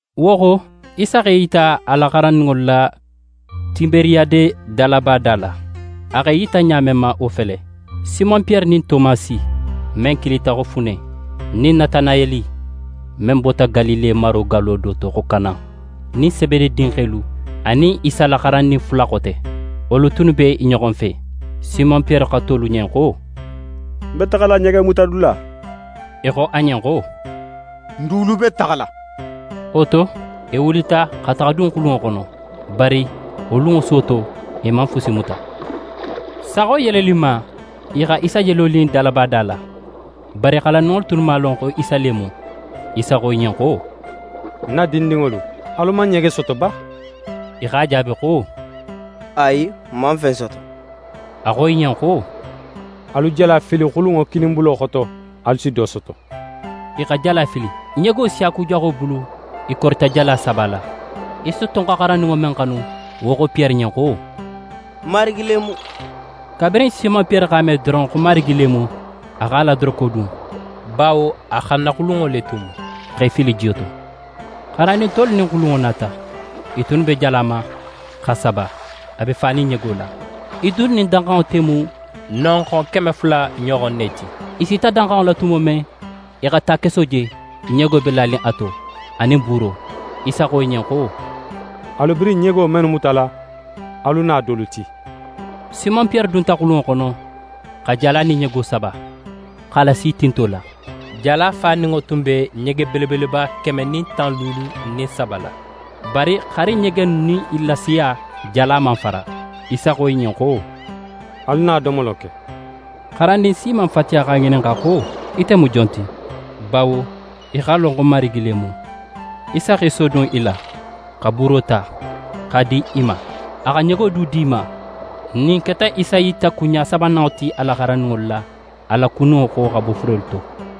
Wo xo, Isa x'é yita a la xarandinŋolu la Tiberiyade dalaba da la. A x'é yita ɲa men ma, wo fele: Simon Piyere nin Tomasi, men kilita xo Fune, nin Natanayeli, men bota Galile maro gallo do to xo Kana, nin Sebede dinxelu anin Isa la xarandin fula xote, wolu tunnu be i ɲoxo fe. Simon Piyere xo tolu ɲen xo: «Ń be taxala ɲegemutadula.» I xo a ɲen xo: «N dulu be taxala.» Wo to, i wulita xa taxa dun xulunŋo xono. Bari wo lunŋo suwo to, i man fusi muta. Saxo yeleninma, i xa Isa je lonin dalaba da la. Bari xarandinŋo tunnu man a lon xo Isa le mu. Isa xo i ɲen xo: «Ń na dindinŋolu, alu man ɲege soto ba?» I x'a jaabi xo: «Ayi, n man fen soto.» A xo i ɲen xo: «Alu jala fili xulunŋo kininbulo xoto, alu si do soto.» I xa jala fili. Ɲego siyakujaxo bulu, i korita jala sabala. Isa tun xa xarandinŋo men xanu, wo xo Piyere ɲen xo: «Marigi le mu!» Kabirin Simon Piyere x'a me doron xo Marigi le mu, a x'a la doroko dun, bawo a xannaxulunŋo le tun mu, x'é fili jiyo to. Xarandin tolu nin xulunŋo nata. I tunnu be jala ma, x'a saba, a be fanin ɲego la. I tunnu nin danxanŋo te mu nonxon keme fula ɲoxon ne ti. I sita danxanŋo la tumo men, i xa takeso je, ɲego be lanin a to, anin buuro. Isa xo i ɲen xo: «Alu birin ɲego mennu mutala, alu na dolu ti.» Simon Piyere dunta xulunŋo xono, xa jala nin ɲego saba, x'a lasi tinto la. Jala faninŋo tun be ɲege belebeleba keme nin tan luulu nin saba la. Bari haali ɲege innu nin i la siya, jala man fara. Isa xo i ɲen xo: «Alu na domolo ke.» Xarandin si man fatiya x'a ŋininxa xo: «Ite mu jon ti!» Bawo i x'a lon xo Marigi le mu. Isa x'é sodun i la, xa buuro ta, x'a di i ma. A xa ɲego du di i ma. Ɲin keta Isa yita kunɲa sabananŋo ti a la xarandinŋolu la, a kuniyo xo xa bo furelu to.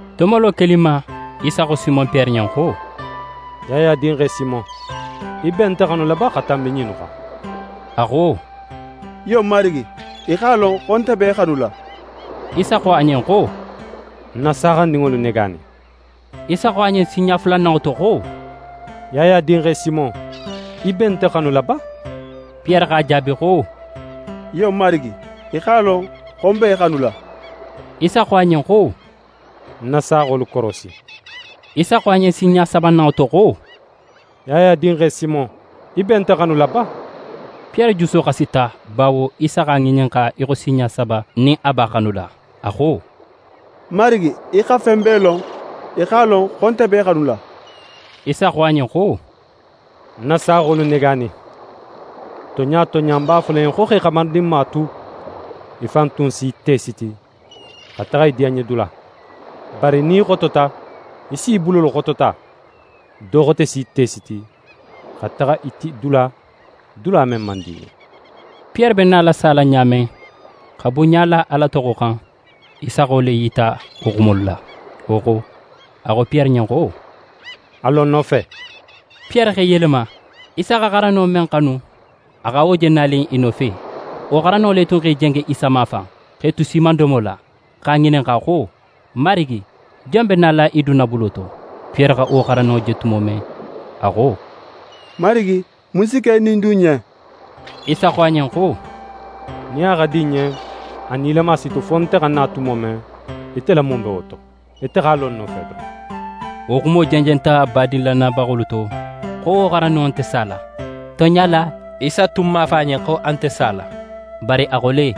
Domolo keninma, Isa xo Simon Piyere ɲen xo: «Yaya dinxe Simon, í be nte xanula ba xa tanbi ɲinnu xan?» A xo: «Iyo Marigi, í x'a lon xo nte b'é xanula.» Isa xo a ɲen xo: «Ń na saaxandinŋolu negaani.» Isa xo a ɲen sinɲa fulananŋo to xo: «Yaya dinxe Simon, í be nte xanula ba?» Piyere x'a jaabi xo: «Iyo Marigi, í x'a lon xo ń b'é xanula.» Isa xo a ɲen xo: «Ń na saaxolu korosi.» Isa xo a ɲen sinɲa sabananŋo to xo: «Yaya dinxe Simon, í be nte xanula ba?» Piyere juso xasita bawo Isa x'a ŋininxa í xo sinɲa saba nin a b'a xanula. A xo: «Marigi, í xa fen bee lon. Í x'a lon xo nte b'é xanula.» Isa xo a ɲen xo: «Ń na saaxolu negaani. Tonɲa tonɲa, ń b'a fola í ɲen xo, x'é xamarindinma tu, í fan tun si í te siti, xa taxa í diyanɲedula. Bari nin í xotota, í s'í bulolu xotota, do xote s'í te siti, xa taxa í ti dula, dula men man di í ɲen.» Piyere be nala sala ɲa men, xa bunɲa la Ala toxo xan, Isa xa wo le yita wo xumolu la. Wo xo, a xo Piyere ɲen xo: «A lo ń nofe.» Piyere x'é yelema, Isa xa xarandinŋo men xanu, a xa wo nato je i nofe. Wo xarandinŋo le tun x'é jenge Isa mafan, x'e tu siimandomo la, x'a ŋininxa xo: «Marigi, jon be nala í dunna bulo to?» Piyere xa wo xarandinŋo je tumo men, a xo: «Marigi, mun si ke ɲin dun ɲen?» Isa xo a ɲen xo: «Nin a xa di ń ɲen, a nilama si tu fo nte xa na tumo men, ite la mun be wo to? Ite x'a lo ń nofe doron.» Wo xumo jenjenta badin lannayabaxolu to, xo wo xarandinŋo nte sala. Tonɲa la, Isa tun man a fo a ɲen xo a nte sala. Bari a xo le: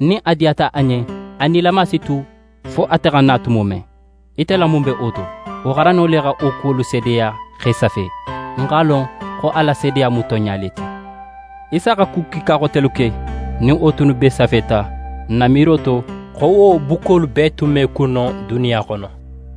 «Nin a xa di ń ɲen, a nilama si tu fo nte xa na tumo men. Ite la mun be wo to?» Wo xarandinŋo le xa wo kuwolu seedeya x'e safe. N x'a lon, xo a la seedeya mu tonɲa le ti. Isa xa ku kiika xotelu ke, nin wo tunnu bee safeta, ń na miiro to, xo wo bukkolu bee tun me kun no duniya xono.